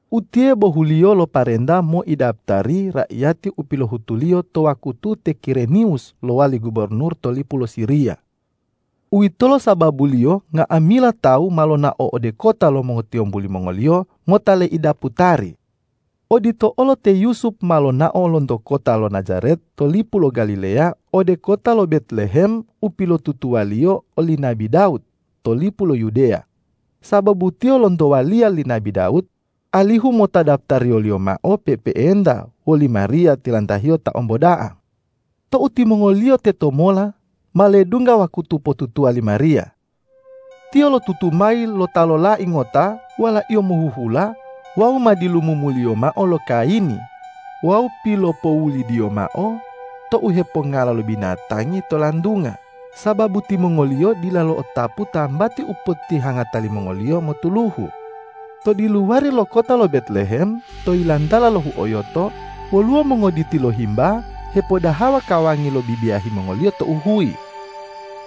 Utiye bohuliyo lo parenta moidaputari raiyati u pilohutuliyo to wakutu te Kireniwus lowali gubornur to lipu lo Siriya. Uwitolo sababuliyo nga'amila tawu ma lonao ode kota lo mongotiyombu limongoliyo mota leidaputari. Odito olo te Yusup ma lonao lonto kota lo Najaret to lipu lo Galileya ode kota lo Betlehem u pilotutuwaliyo oli nabi Dawud to lipu lo Yudeya, sababu tiyo lonto waliya li nabi Dawud, alihu mota daputariyoliyo mao pe'epe'enta woli Mariya tilantahiyo ta omboda'a. Tou timongoliyo tetomola, ma ledungga wakutu potutuwa li Mariya. Tiyo lotutu mayi lo ta lolai ngota, walaiyo mohuhula, wawu ma dilumumuliyo mao lo kayini wawu pilopoulidiyo mao to u hepongala lo binatangi to lantunga, sababu timongoliyo dila lo'otapu tambati u potihangata limongoliyo motuluhu. To diluwari lo kota lo Betlehem to yilantala lo huoyoto, woluwo mongoditi lo himba hepodahawa kawangi lo bibiyahi mongoliyo tou huyi.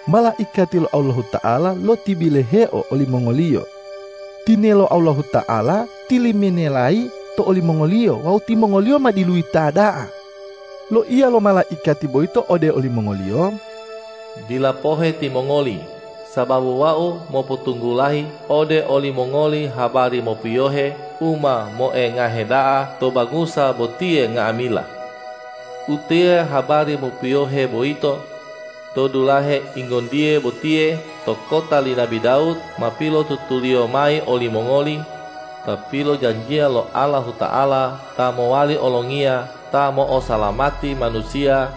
Malaikati lo Allahuta'ala lotibiloheo olimongoliyo. Tinelo Allahuta'ala tiliminelayi to olimongoliyo wawu timongoliyo ma diluyita da'a. Loiya lo malaikati boyito ode olimongoliyo,”Dila pohe timongoli, sababu wau mopotunggulayi ode olimongoli habari mopiyohe u ma moengahe da'a to bangusa botiye nga'amila. Utiye habari mopiyohe boyito: To dulahe ingontiye botiye to kota li nabi Dawud ma pilotutuliyo mayi olimongoli, Ta pilojanjiya lo Allahuta'ala ta mowali olongiya ta mo'osalamati manusiya,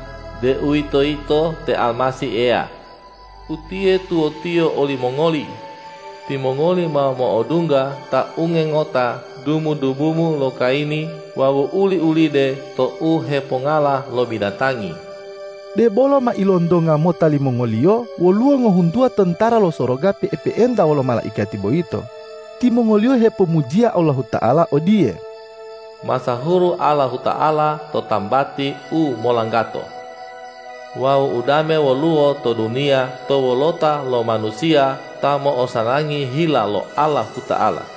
deuwitoyito te Almasih Eya. Utiye tuwotiyo olimongoli: Timongoli ma mo'odungga Ta unge ngota dumu-dumumu lo kayini wawu uli-ulide to u hepongala lo binatangi.” Debolo ma ilontonga mota limongoliyo woluwo ngohuntuwa tontara lo soroga pe'epe'enta wolo malaikati boyito. Timongoliyo hepomujiya Allahuta'ala odiye, ”Masahuru Allahuta'ala to tambati u molanggato! Wawu udame woluwo to duniya to wolota lo manusiya ta mo'osanangi hila lo Allahuta'ala!”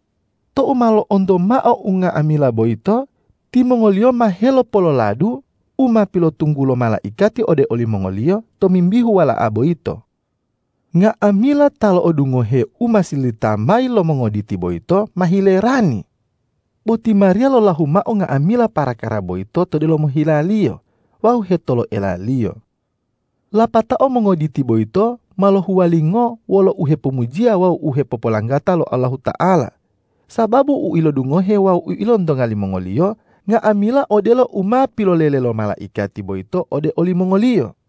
Tou ma lo'onto mao unga'amila boyito, timongoliyo ma helopololadu u ma pilopotunggulo malaikati ode olimongoliyo tomimbihu Wala'a boyito. Nga'amila ta lo'odungohe u ma sililita mayi lo mongoditi boyito ma hilerani. Bo ti Mariya lolahu mao nga'amila parakara boyito to delomo hilaliyo wawu hetoloelaliyo. Lapatao mongoditi boyito ma lohuwalingo wolo uhepomujiya wawu hepopolanggata lo Allahuta'ala, sababu u ilodungohe wawu u ilontonga limongoliyo, nga'amila odelo u ma pilolele lo malaikati boyito ode olimongoliyo.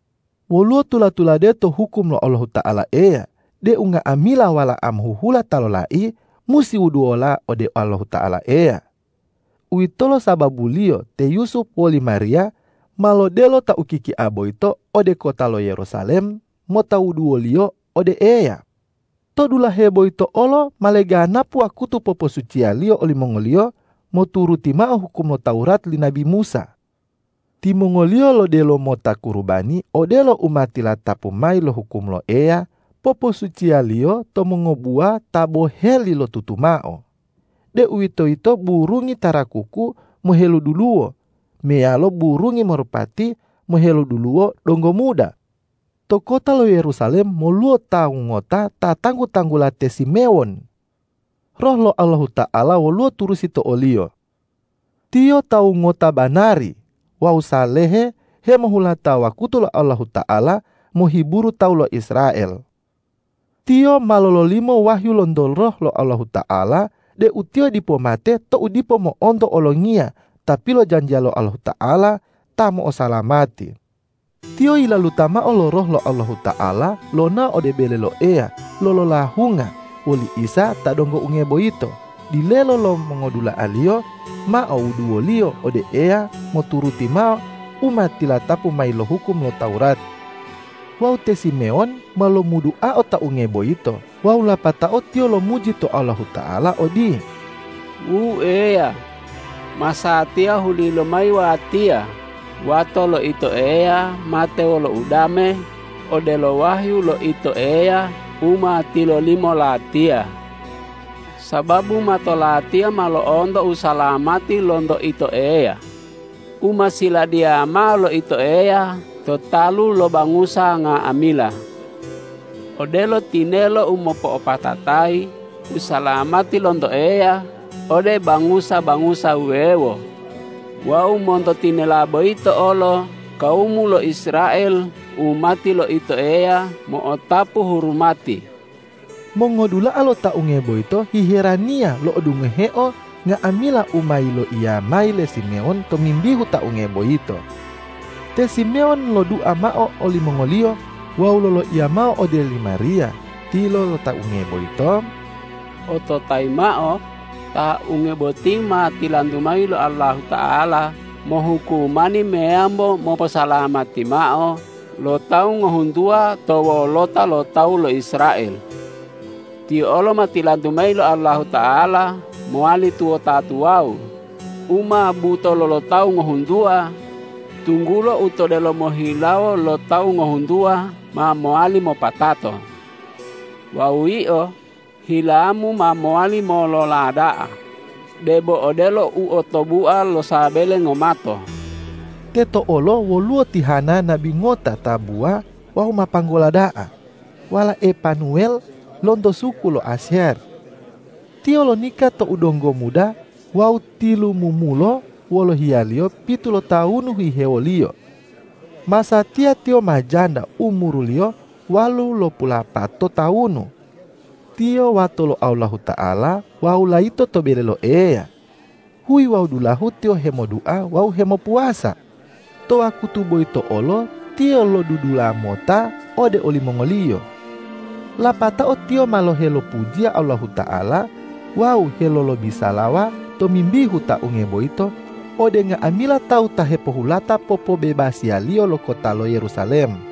Woluwo tula-tulade to hukum lo Allahuta'ala Eya deu nga'amila wala'a mohuhula ta lolai musi wuduwola ode Allahuta'ala Eya. Uwitolo sababuliyo te Yusup woli Mariya ma lodelo Ta ukikia boyito ode kota lo Yerusalem mota wuduwoliyo ode Eya. To dulahe boyito olo ma leganapu wakutu poposuciyaliyo olimongoliyo moturuti mao hukum lo Tawurat li nabi Musa. Timongoliyo lodelo mota kurubani odelo u ma tilatapu mayi lo hukum lo Eya poposuciyaliyo to mongobuwa ta boheli lotutu mao, deuwitoyito burungi tarakuku moheluduluwo meyalo burungi marupati moheluduluwo donggo muda. To kota lo Yerusalem woluwo tawu ngota ta tanggu-tanggula te Simewon. Roh lo Allahuta'ala woluwo turusi to oliyo. Tiyo tawu ngota banari wawu salehe hemohulata wakutu lo Allahuta'ala mohiburu tawu lo Israel. Tiyo ma lololimo wahyu lonto Roh lo Allahuta'ala deu tiyo dipo mate tou dipo mo'onto Olongiya ta pilojanjiya lo Allahuta'ala ta mo'osalamati. Tiyo yilaluta mao lo Roh lo Allahuta'ala lonao ode bele lo Eya lololahunga woli Isa ta donggo unge boyito, dilelo lo mongodula'a-Liyo mao wuduwoliyo ode Eya moturuti mao u ma tilatapu mayi lo hukum lo Tawurat. Wawu te Simewon ma lomuduao Ta unge boyito wawu lapatao tiyo lomuji to Allahuta'ala odiye, ”Wu Eya, masatiya huli lomayi watiya wato lo Ito Eya mate wolo udame, odelo wahyu lo Ito Eya u ma tilolimo latiya. Sababu mato latiya ma lo'onto usalamati lonto Ito Eya u ma siladiya mao lo Ito Eya to talu lo bangusa nga'amila: Odelo tinelo u mopo'opatatayi usalamati lonto Eya ode bangusa-bangusa wuwewo wawu monto tinela boyito olo kawumu lo Israel umati lo Ito Eya mo'otapu hurumati.” Mongodula'a lo Ta unge boyito hiheraniya lo'odungoheo nga'amila u ma yiloiya mayi le Simewon tomimbihu Ta unge boyito. Te Simewon lodua mao olimongoliyo wawu loloiya mao ode li Mariya tilo lo Ta unge boyito,”Ototayi mao: Ta unge boti ma tilantu mayi lo Allahuta'ala mohukumani meyambo moposalamati mao lo tawu ngohuntuwa to wolota lo tawu lo Israel. Tiyo olo ma tilantu mayi lo Allahuta'ala mowali tuwota tuwawu u ma butolo lo tawu ngohuntuwa, tunggulo u to delomo hilawo lo tawu ngohuntuwa ma mowali mopatato. Wawu yio, hilamu ma mowali molola da'a, debo odelo u otobua lo sabele ngomato.” Teto olo woluwo ti Hana nabi ngota tabuwa wawu ma panggola da'a, walae Panuwel lonto suku lo Asyer. Tiyo lonika tou donggo muda wawu tilumumulo wolo hiyaliyo pitu lotawunu hihewoliyo. Masatiya tiyo ma janda umuruliyo walulopulapato tawunu. Tiyo wato lo Allahuta'ala wawu layito to bele lo Eya. Huyi wawu dulahu tiyo hemodua wawu hemopuwasa. To wakutu boyito olo tiyo lodudula mota ode olimongoliyo. Lapatao tiyo ma helolopujiya Allahuta'ala wawu helolobisalawa tomimbihu Ta unge boyito ode nga'amila tawu ta hepohulata popobebasiyaliyo lo kota lo Yerusalem.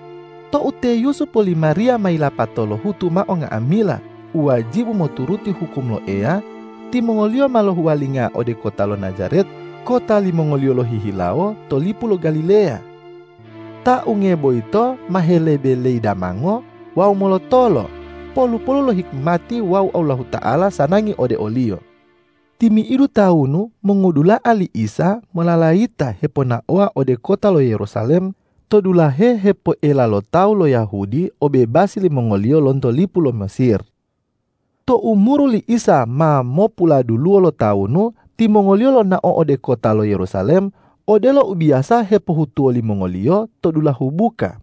Tou te Yusup woli Mariya ma yilapato lohutu mao nga'amila u wajibu moturuti hukum lo Eya, timongoliyo ma lohuwalinga ode kota lo Najaret kota limongoliyo lohihilawo to lipu lo Galileya. Ta unge boyito ma helebe leidamango wawu molotolo, polu-polu lo hikimati wawu Allahuta'ala sanangi ode o-Liyo. Timi'idu tawunu mongodula'a li Isa mololayita hiponaowa ode kota lo Yerusalem to dulahe hepoela lo tawu lo Yahudi obebasi limongoliyo lonto lipu lo Mesir. Tou umuru li Isa ma mopuladuluwo lotawunu, timongoliyo lonao ode kota lo Yerusalem odelo u biyasa hepohutuwo limongoliyo to dulahu buka.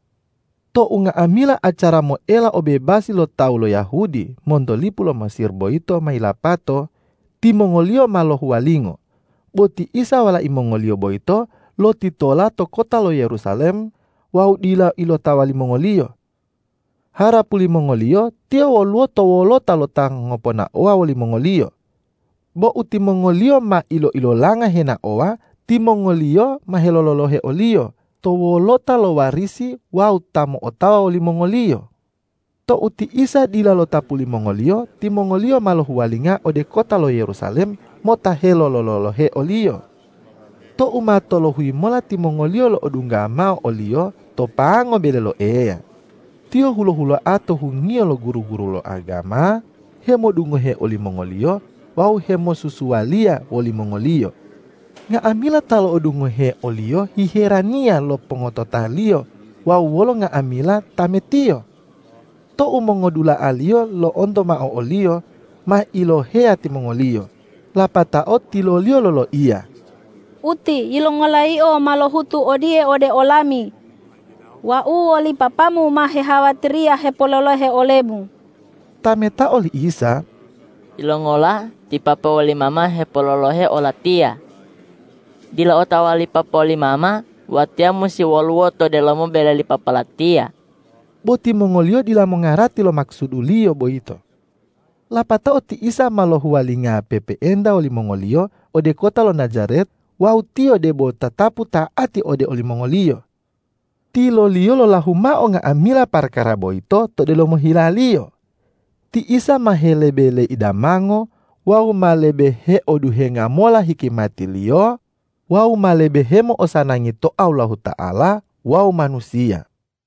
Tou nga'amila acara moela obebasi lo tawu lo Yahudi monto lipu lo Mesir boyito ma yilapato, timongoliyo ma lohuwalingo, bo ti Isa walai mongoliyo boyito lotitola to kota lo Yerusalem wawu dila ilotawa limongoliyo. Harapu limongoliyo Tiyo woluwo to wolota lo ta ngoponaowa wolimongoliyo. Bo tou timongoliyo ma ilo-ilolanga henaowa, timongoliyo ma helolo-lolohe o-Liyo to wolota lo warisi wawu ta mo'otawa wolimongoliyo. Tou ti Isa dila lotapu limongoliyo, timongoliyo ma lohuwalinga ode kota lo Yerusalem mota helolo-lolohe o-Liyo. Tou ma tolohuyi mola timongoliyo lo'odungga mao o-Liyo to pango bele lo Eya. Tiyo hulo-huloa to hungiyo lo guru-guru lo agama, hemodungohe olimongoliyo wawu hemosusualiya wolimongoliyo. Nga'amila ta lo'odungohe o-Liyo hiheraniya lo pongotota-Liyo wawu wolo nga'amila tame-Tiyo. Tou mongodula'a-Liyo lo'onto mao o-Liyo, ma iloheya timongoliyo. Lapatao tilo-Liyo loloiya,”Uti, yilongola Yio ma lohutu odiye ode olami? Wau woli papa-Mu ma hehawatiriya hipololohe ole-Mu!” Tametao li Isa,”Yilongola ti papa woli mama hepololohe o-Latiya? Dila otawa li papa woli mama, Watiya musi woluwo to delomo bele li Papa Latiya?” Bo timongoliyo dila mongarati lo makusudu-Liyo boyito. Lapatao ti Isa ma lohuwalinga pe'epe'enta wolimongoliyo ode kota lo Najaret wawu Tiyo debo tatapu ta'ati ode olimongoliyo. Tilo-Liyo lolahu mao nga'amila parakara boyito to delomo hilaliyo. Ti Isa ma helebe leidamango wawu ma lebe heoduhenga mola hikimati-Liyo wawu ma lebe hemo'osanangi to Allahuta'ala wawu manusiya.